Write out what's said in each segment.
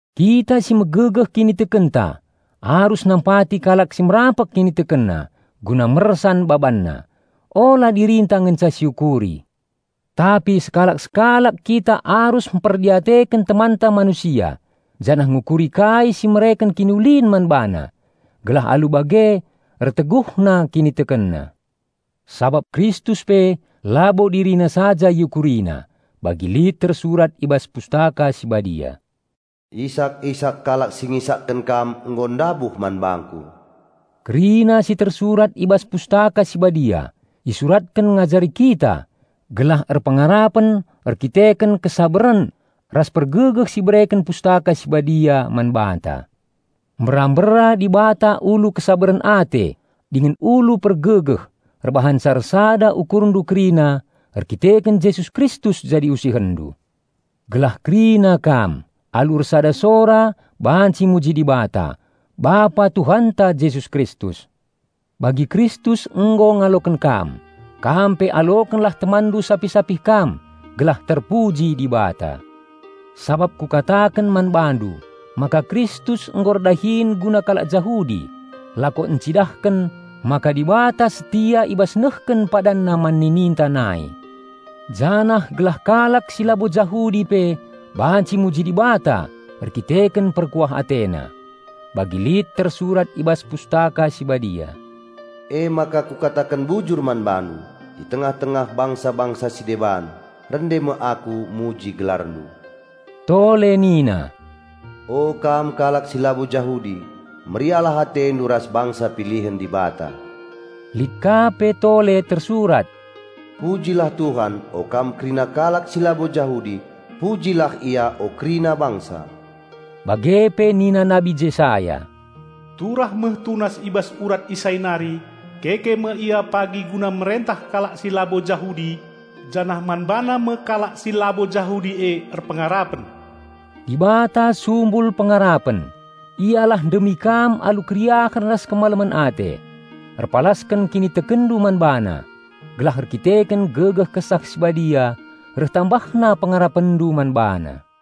Kita si megegeh kinitekenta arus nampati kalak si merampek kinitekenna, guna mersan babanna. Ula dirinta ngenca siukuri. Tapi sekalak-sekalak kita arus mperdiateken temanta manusia janah ngukuri kai si mereken kiniulin man bana gelah alu bage erteguhna kinitekenna. Sabap Kristus pe labo DiriNa saja IukuriNa, bagi lit tersurat i bas Pustaka Si Badia, "Isak-isak kalak si ngisakken Kam nggo ndabuh man bangku." Kerina si tersurat i bas Pustaka Si Badia isuratken ngajari kita gelah erpengarapen erkiteken kesabaren ras pergegeh si ibereken Pustaka Si Badia man banta. Mbera-mbera Dibata ulu kesabaren ate dingen ulu pergegeh erbahanca ersada ukurndu kerina erdandanken Jesus Kristus jadi usihenndu. Gelah kerina kam, alu ersada sora banci muji Dibata, Bapa Tuhanta Jesus Kristus. Bagi Kristus nggo ngaloken kam, kam pe alokenlah temanndu sapih-sapih kam gelah terpuji Dibata. Sabap kukataken man bandu maka Kristus nggo erdahin guna kalak Jahudi lako encidahken maka Dibata setia i bas nehken PadanNa man nininta nai. Janah gelah kalak si labo Jahudi pe banci muji Dibata erdandanken perkuah AteNa. Bagi lit tersurat i bas Pustaka Si Badia, "Emaka kukataken bujur man BaNdu, i tengah-tengah bangsa-bangsa si deban, rende me aku muji GelarNdu." Tole nina, "O kam kalak si labo Jahudi, meriahlah atendu ras bangsa pilihen Dibata." Lit ka pe tole tersurat, "Pujilah Tuhan o kam kerina kalak si labo Jahudi; pujilah Ia o kerina bangsa." Bage pe nina Nabi Jesaya, "Turah me tunas i bas urat Isai nari, keke me Ia pagi guna merentah kalak si labo Jahudi, janah man BaNa me kalak si labo Jahudi e erpengarapen." Dibata sumbul pengarapen, Ialah ndemi kam alu keriahen ras kemalemen ate, erpalasken kinitekenndu man BaNa, gelah erkiteken gegeh Kesah Si Badia reh tambahna pengarapenndu man BaNa.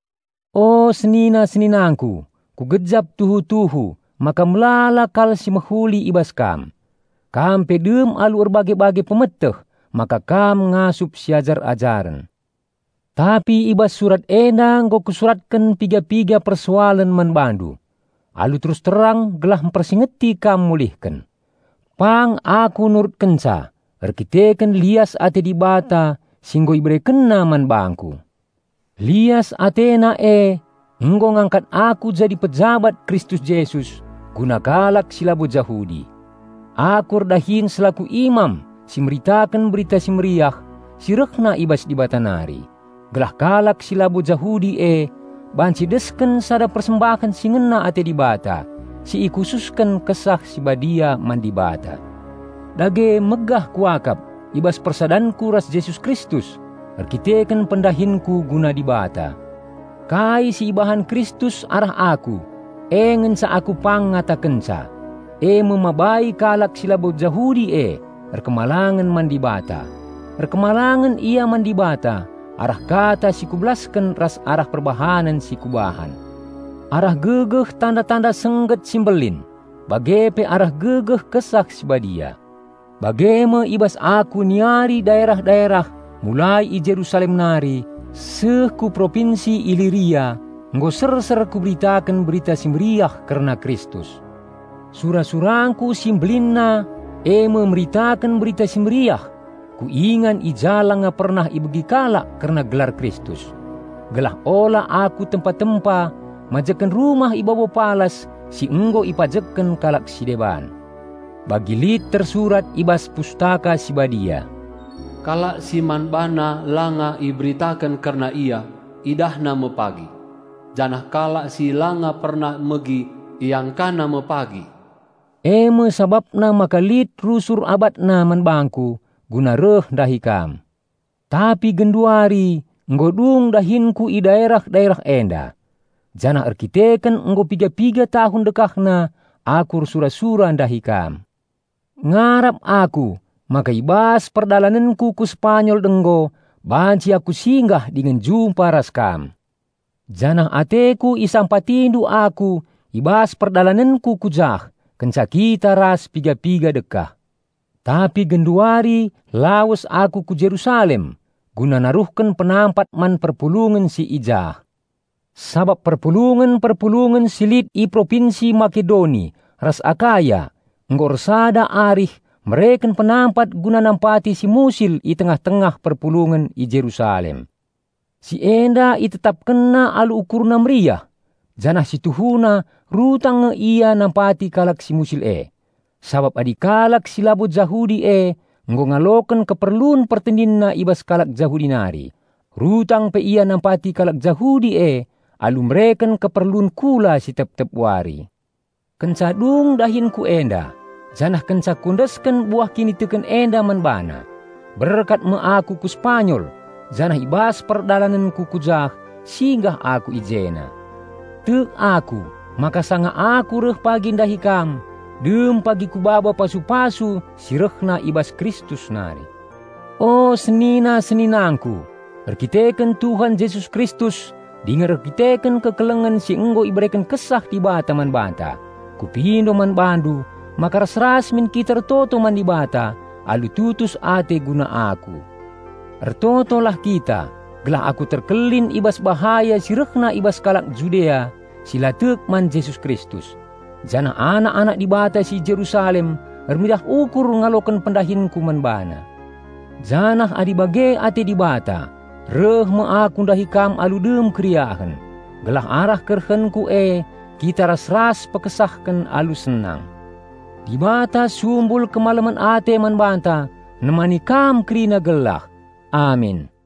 O seninang-seninangku, kugejap tuhu-tuhu maka melala kal si mehuli i bas kam. Kam pe dem alu erbage-bage pemeteh maka kam ngasup siajar-ajaren. Tapi i bas surat enda nggo kusuratken piga-piga persoalen man bandu alu terus terang gelah mpersingeti kam mulihken. Pang aku nurutkenca erdandanken lias ate Dibata si nggo IberekenNa man bangku. Lias AteNa e nggo ngangkat aku jadi pejabat Kristus Jesus guna kalak si labo Jahudi. Aku erdahin selaku imam si meritaken Berita Si Mehuli si rehna i bas Dibata nari, gelah kalak si labo Jahudi e banci desken sada persembahen si ngena ate Dibata si ikhususken Kesah Si Badia man Dibata. Dage megah kuakap i bas persadanku ras Jesus Kristus erkiteken pendahinku guna Dibata. Kai si ibahan Kristus arah aku, e ngenca aku pang ngatakenca, eme mabai kalak si labo Jahudi e patuh man Dibata. Patuh ia man Dibata arah kata si kubelasken ras arah perbahanen si kubahan. Arah gegeh tanda-tanda sengget si mbelin, bage pe arah gegeh Kesah Si Badia. Bage me i bas aku niari daerah-daerah mulai i Jerusalem nari seh ku propinsi Iliria nggo serser kuberitaken Berita Si Mehuli kerna Kristus. Sura-surangku si mbelinna eme meritaken Berita Si Mehuli ku ingan i ja langa pernah ibegi kalak kerna gelar Kristus, gelah ula aku tempa-tempa majekken rumah i babo palas si nggo ipajekken kalak si deban. Bagi lit tersurat i bas Pustaka Si Badia, "Kalak si man bana langa iberitaken kerna Ia, idahna me pagi, janah kalak si langa pernah megi, iangkana me pagi." Eme sabapna maka lit rusur abatna man bangku guna reh ndahi kam. Tapi genduari nggo dung dahinku i daerah-daerah enda. Janah erkiteken nggo piga-piga tahun dekahna aku ersura-sura ndahi kam, ngarap aku maka i bas perdalanenku ku Sepanyol denggo banci aku singgah dingen jumpa ras kam. Janah ateku isampatindu aku i bas perdalanenku ku jah kenca kita ras piga-piga dekah. Tapi genduari lawes aku ku Jerusalem guna naruhken penampat man perpulungen si i jah. Sabap perpulungen-perpulungen si lit i Propinsi Makedoni ras Akaya nggo ersada arih mereken penampat guna nampati si musil i tengah-tengah perpulungen i Jerusalem. Si enda itetapkenna alu ukurna meriah. Janah si tuhuna rutang nge ia nampati kalak si musil e, sabap adi kalak si labo Jahudi e nggo ngaloken keperlun pertendinna i bas kalak Jahudi nari, rutang pe ia nampati kalak Jahudi e alu mereken keperlun kula si tep-tep wari. Kenca dung dahinku enda, janah kenca kuendesken buah kiniteken enda man bana, berkat me aku ku Sepanyol, janah i bas perdalanenku ku jah singgah aku i jena. Tek aku maka sanga aku reh pagi ndahi kam, dem pagi kubaba pasu-pasu si rehna i bas Kristus nari. O senina-seninangku, erdandanken Tuhan Jesus Kristus dingen erdandanken kekelengen si nggo ibereken Kesah Dibata man banta, kupindo man bandu maka ras-ras min kita ertoto man Dibata alu tutus ate guna aku. Ertotolah kita gelah aku terkelin i bas bahaya si rehna i bas kalak Judea si la tek man Jesus Kristus, janah anak-anak Dibata si Jerusalem ermeriah ukur ngaloken pendahinku man bana. Janah adi bage ate Dibata, reh me aku ndahi kam alu dem keriahen, gelah arah kerehenku e kita ras-ras pekesahken alu senang. Dibata sumbul kemalemen ate man banta, nemani kam kerina gelah! Amin.